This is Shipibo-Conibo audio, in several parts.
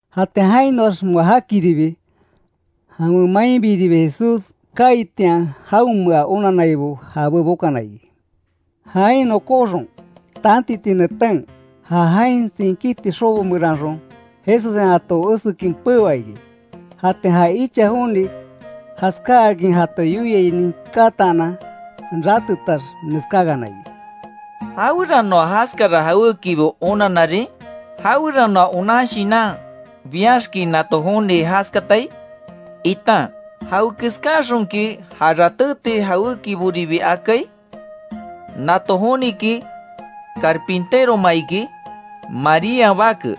Jatian jainoax moa jakiribi, jawen mainbiribi Jesús kaaitian, jaonmea onannaibo jabé bokana iki. Jain nokóxon, tantiti neten, ja jain tsinkíti xobo meranxon, Jesussen jato esekin peoa iki. Jatian ja icha joni, jaskáakin jato yoiai ninkataanan, ratetax, neskákana iki: —¿Jaweranoa jaskara jawékibo onanarin? ¿Jaweranoa onan shinan biaxki nato joni jaskatai? Itan ¿Jawekeskaxonki ja ratéti jawékiboribi akai? ¿Nato joniki carpinteroma iki, Marían bake?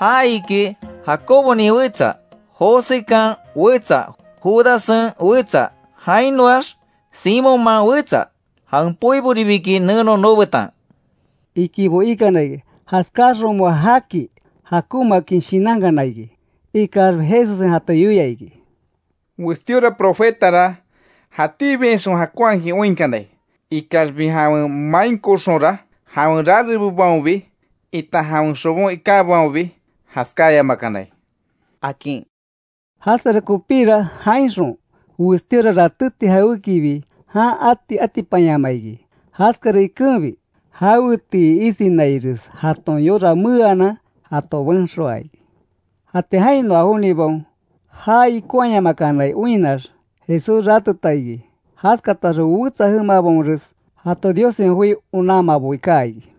Já iki, Jacobonin wetsa, Josekan wetsa, Judassen wetsa, jainoax Simonman wetsa. Jawen poiboribi iki neno noobetan —ikibo ikana iki. Jaskáaxon moa jaki jakonmaakin shinankana iki. Ikaxbi, Jesussen jato yoia iki: —Westíora profetara, jatíbiainxon jakonhakin oinkanai. Ikaxbi jawen mainkoxonra, jawen rarebobaonbi, itan jawen xobon ikábaonbi, jaskáyamakanai —akin. Jaskara kopíra, jainxon westíora ratéti jawékibi jan ati atipanyamaa iki. Jaskara ikenbi, jawetii isinaires jaton yora meeanan, jato benxoaa iki. Jatian jainoa jonibaon, já ikonhaayamakanai oinnax, Jesús rateta iki. Jaskatax wetsa jemabaonres, jato Diossen joi onanmaboi kaa iki.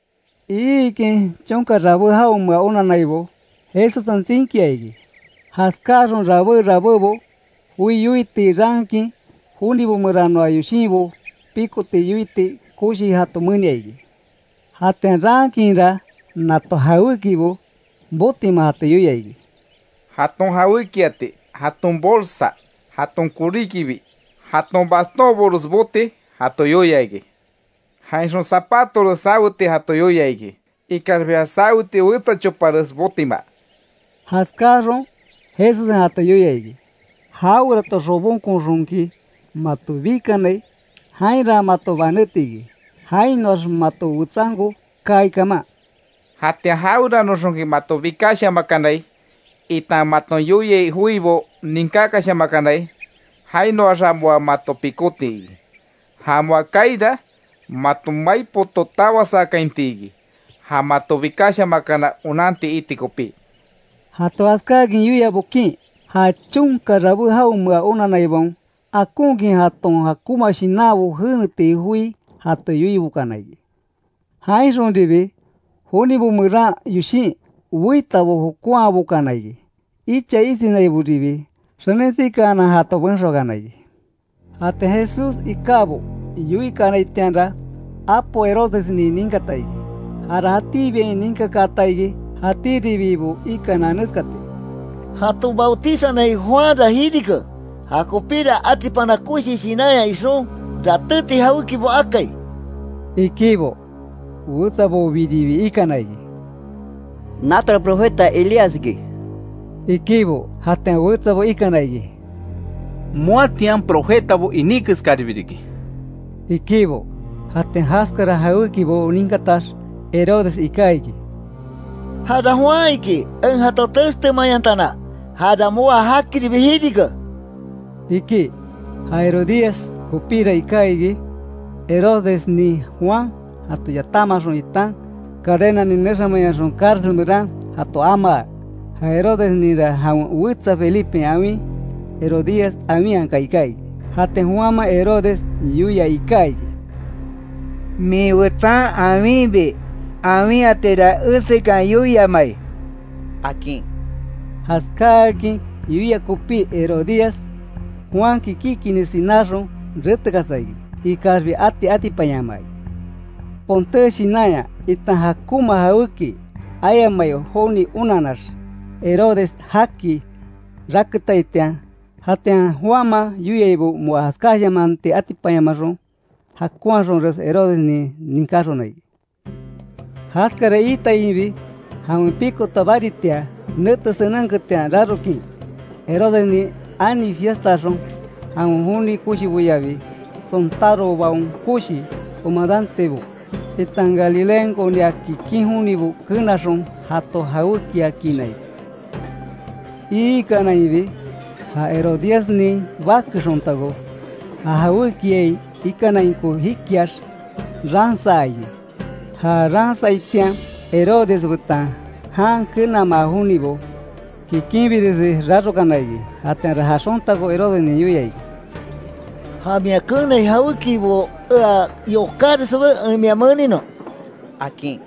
Iikin chonka rabé jaonmea onannaibo, Jesussen tsinkia iki. Jaskáxon rabé rabébo, joi yoiti raankin; jonibo meranoa yoshinbo pikoti, yoiti koshi jato menia iki. Jatian raankinra, nato jawékibo botima jato yoia iki: Jaton jawékiati, jaton bolsa, jaton koríkibi. Jaton bastónbores boti jato yoia iki. Jainxon, zapatores saweti jato yoia iki. Ikaxbi ja saweti wetsa chopares botima. Jaskáaxon, Jesussen jato yoia iki, jawerato xobonkoxonki mato bikanai, jainra mato banéti iki, jainoax mato wetsanko kaai kaman. Jatian jaweranoxonki mato bikashamakanai, itan maton yoiai joibo ninkákashamakanai, jainoaxa moa mato pikóti iki. Ja moa kaaira, mato mai poto tawasakainti iki, ja mato bikashamakana onanti iti kopí. Jato jaskáakin yoia bokin, ja chonka rabé jaonmea onanaibaon, akonkin jaton jakonma shinanbo jeneti joi jato yoibokana iki. Jainxonribi, jonibo meran yoshin weitabo jokonhabokana iki. Icha isinaiboribi, xenin sikaanan jato benxoakana iki. Jatian Jesús ikábo yoikanaitianra, apo Herodesnin ninkata iki, jara jatíbiain ninkakaata iki. Jatíribibo ikana neskati: “Jato bautizanai Juanra jirike, jakopira atipana koshi shinanya ixon, ratéti jawékibo akai”, ikibo. Wetsabobiribi ikana iki: “Natora profeta Elías iki”, ikibo. Jatian wetsabo ikana iki: “Moatian profetabo iní keskaribi riki”, ikibo. Jatian jaskara jawékibo ninkatax, Herodes iká iki: —Jara Juan iki, en jato textemayantana, jara moa jakiribi jirike —iki. Ja Herodías kopíra iká iki Herodesnin Juan jato yatamaxon itan cadenanin nexamayonxon cárcel meran jato amaa. Ja Herodesninra jawen wetsa Felipen awin Herodías awinhaka iká iki. Jatian Juanman Herodes yoia iká iki: —Min wetsan awinbi, awinhatira esekan yoiamai —akin. Jaskáakin yoia kopí Herodías, Juanki kikinni sináxon, retekasa iki; ikaxbi ati atipanyamaa iki, ponté shinanya, itan jakonma jawéki ayamai joni onanax, Herodes jaki raketaitian. Jatian Juanman yoiaibo moa jaskáshamanti atipanyamaxon, jakonhaxonres Herodesnin ninkáxona iki. Jaskara iitainbi, jawen pikota baritia nete senenketian rarokin, Herodesnin ani fiestaaxon, jawen joni koshiboyabi sontárobaon koshi comadantebo, itan Galileankonia kikin jonibo kenaxon jato jawékiakiina iki. Iikanainbi, ja Herodíasnin bake xontako, ja jawékiai ikanainko jikiax ransaa iki. Ja ransaitian, Herodes betan jan kenamaa jonibo, kikinbiresi rarokana iki, jatianra ja xontako Herodesnin yoia iki: —Ja mia keenai jawékibo ea yokákinreswe, en mia meninon —akin.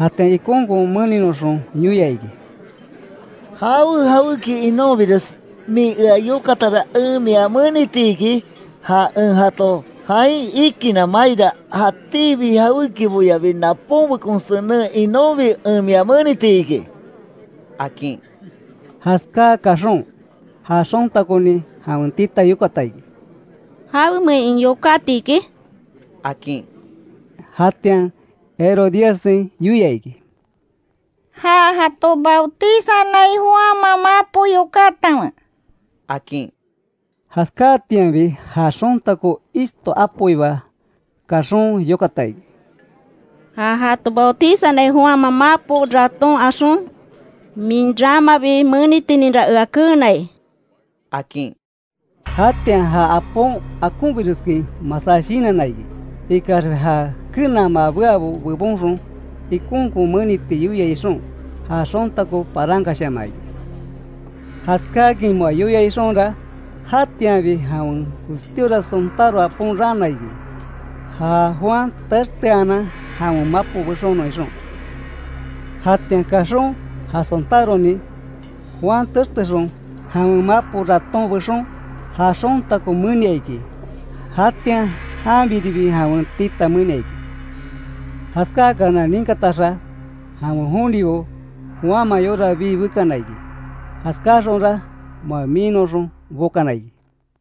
Jatian ikonkon meninoxon yoia iki: —Jawe jawéki inonbires min ea yokatara, en mia meniti iki. Ja en jato jain ikinna maira, jatíbi jawékiboyabi naponbekon senen inonbi en mia meniti iki —akin. Jaskáa kaxon, ja xontakonin jawen tita yokata iki: —¿Jawemein en yokáti iki? —akin. Jatian Herodíassen yoia iki: —Ja jato bautizanai Juanman mapo yokátanwe —akin. Jaskáatianbi, ja xontako ishto apoiba kaxon, yokata iki: —Ja jato bautizanai Juanman mapo raton axon, min ramabi menitininra ea keenai —akin. Jatian ja apon akonbireskin masá shinanna iki. Ikaxbi ja kenama beabo bebonxon ikonkon meniti yoia ixon, ja xontako parankashamaa iki. Jaskáakin moa yoia ixonra, jatianbi jawen westíora sontáro apon raana iki; ja Juan texteanan, jawen mapo bexonon ixon. Jatian kaxon ja sontáronin, Juan textexon, jawen mapo raton bexon, ja xontako menia iki, jatian janbiribi jawen tita menia iki. Jaskáakana ninkataxa, jawen jonibo, Juanman yora bii bekana iki, jaskáaxonra moa miinnoxon bokana iki.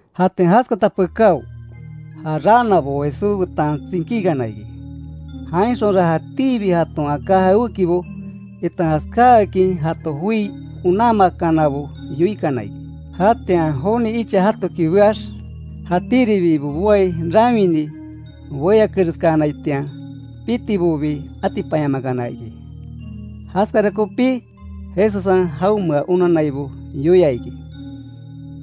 Jatian jaskata pekáo, ja raanabo Jesús betan tsinkíkana iki. Jainxonra jatíbi jaton aká jawékibo, itan jaskáakin jato joi onanmakanabo yoikana iki. Jatian joni icha jatoki beax, jatíribibo boai rawini beyakereskanaitian, pitibobi atipanyamakana iki. Jaskara kopí, Jesussen jaonmea onannaibo yoia iki: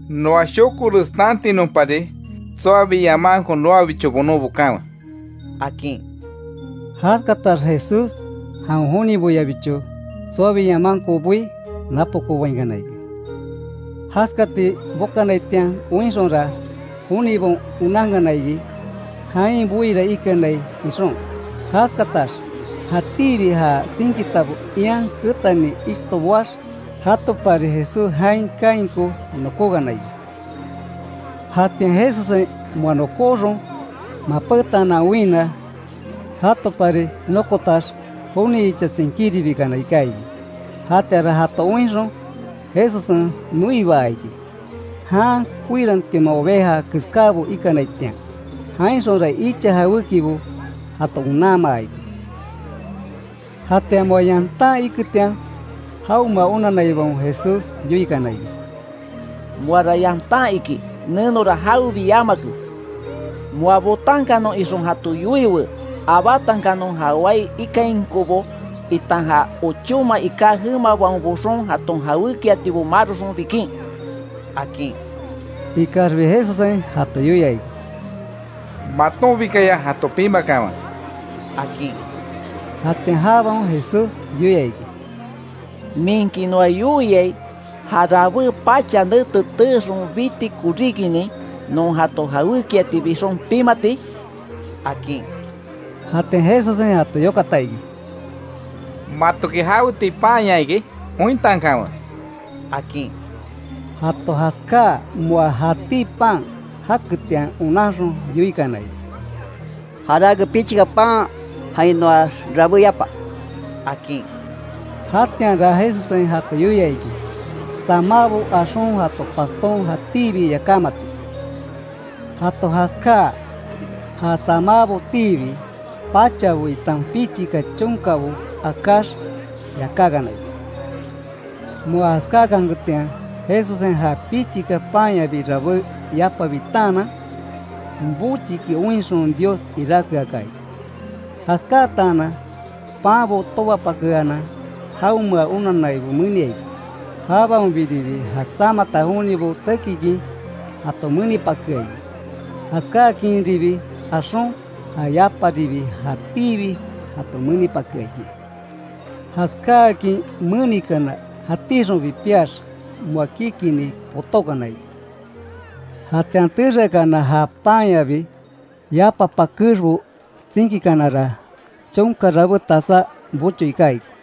—Noa shokores tantinonpari, tsoabi yamanko noabicho bonon bokanwe —akin. Jaskatax Jesús jawen joniboyabicho tsoabi yamanko boí, napokoobainkana iki. Jaskati bokanaitian oinxonra jonibaon onankana iki, jain boira ikanai ixon. Jaskatax, jatíbi ja tsinkitabo ian ketani ishto boax, jatopari Jesús jain kainko nokókana iki. Jatian Jesussen moa nokóxon mapétaanan oinna, jatopari nokotax joni icha tsinkíribikana iká iki. Jatianra jato oinxon Jesussen noibaa iki, jan koirantioma oveja keskábo ikanaitian, jainxonra icha jawékibo jato onanmaa iki. Jatian moa yantan iketian, jaonmea onanaibaon Jesús yoikana iki: —Moara yantan iki nenora jawebi yamake. Moa botankanon ixon jato yoiwe; abátankanon ja wai ikainkobo itan ja ochóma iká jemabaon boxon jaton jawékiatibo maroxon bikin —akin. Ikaxbi Jesussen jato yoia iki: —Matonbikaya jato pimakanwe —akin. Jatian jabaon Jesús yoia iki: —¿Minki noa yoiai, ja rabé pacha nete teexon biti koríkinin, non jato jawékiati bixon pimati? —akin. Jatian Jesussen jato yokata iki: —¿Matoki jawetii panya iki? Ointankanwe —akin. Jato jaskáa moa jatí pan jaketian onanxon yoikana iki: —Jarake pichika pan jainoax rabé yapa —akin. Jatianra Jesussen jato yoia iki, tsamábo axon jato paston jatíbi yakámati. Jato jaskáa, ja tsamábotiibi pachabo itan pichika chonkabo akáx yakákana iki. Moa jaskákanketian Jesussen ja pichika panyabi rabé yapa bitaanan, bochiki oinxon Dios iráke aka iki. Jaskáatanan panbo tobapakeanan jaonmea onannaibo menia iki. Jabaonbiribi ja tsamata jonibo tekikin jato menipakea iki. Jaskáakinribi axon ja yaparibi jatíbi jato menipakea iki. Jaskáakin menikana jatíxonbi piax moa kikinni potókana iki. Jatian texeakana ja panyabi, yapa pakexbo tsinkíkanara, chonka rabé tasá bocho iká iki.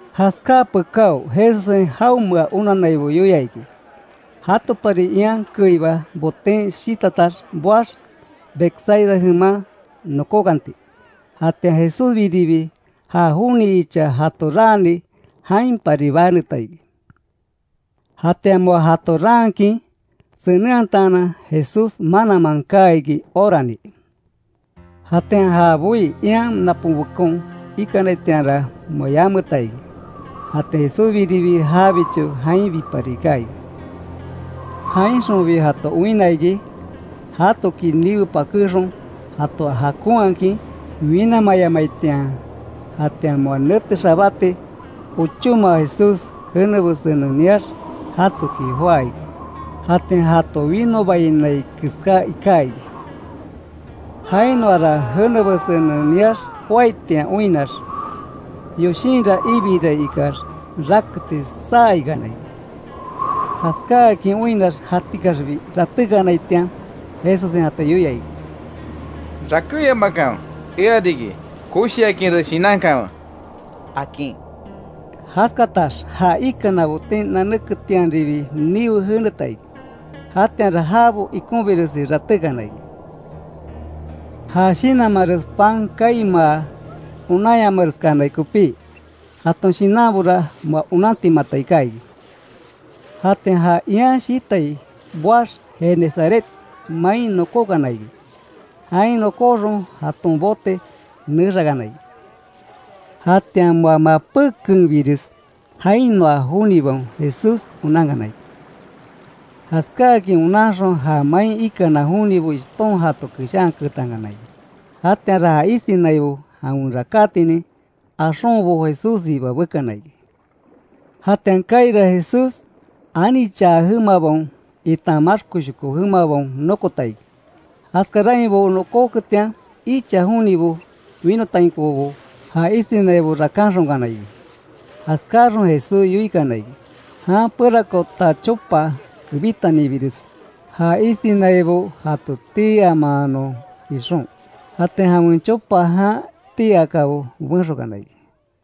Jaskáa pekáo Jesussen jaonmea onannaibo yoia iki, jatopari ian keiba boten shitatax boax, Betsaida jeman nokókanti. Jatian Jesúsbiribi ja joni icha jato raani jainpari baneta iki. Jatian moa jato raankin senenhataanan, Jesús mananman kaa iki, orani. Jatian ja boí ian naponbekon ikanaitianra, moa yameta iki. Jatian Jesúsbiribi jabicho jainbipari iká iki. Jainxonbi jato oinna iki, jatoki niwe pakéxon, jato jakonhakin winamayamaitian. Jatian moa nete xabáti ochóma Jesús jene besenen niax jatoki joá iki. Jatian jato winobainai keská iká iki. Jainoara jene besenen niax joaitian oinnax, yoshinra ibirai ikax, raketi saa ikana iki. Jaskáakin oinnax jatikaxbi ratékanaitian, Jesussen jato yoia iki: —¡Rakéyamakanwe, ea riki, koshiakinres shinankanwe! —akin. Jaskatax ja ikana boten nanéketianribi niwe jeneta iki. Jatianra jabo ikonbiresi ratékana iki, ja shinanmanres pan kaimaa onanyamareskanai kopí. Jaton shinanbora moa onantimata, iká iki. Jatian ja ian shitai boax Genesaret main nokókana iki. Jain nokóxon jaton bote nexakana iki. Jatian moa mapékenbires, jainoa jonibaon Jesús onankana iki. Jaskáakin onanxon ja main ikana jonibo ishton jato keshaanketankana iki. Jatianra ja isinaibo, jawen rakátinin axonbo Jesússiba bekana iki. Jatian kaira Jesús, anichaa jemabaon itan maxkoshoko jemabaon nokota iki. Jaskarainbo nokóketian, icha jonibo winotainkobo ja isinaibo rakanxonkana iki. Jaskáxon Jesús yoikana iki, jan perakoota chopa kebítanibires ja isinaibo jato tii amanon ixon; jatian jawen chopa jan tii akabo benxokana iki.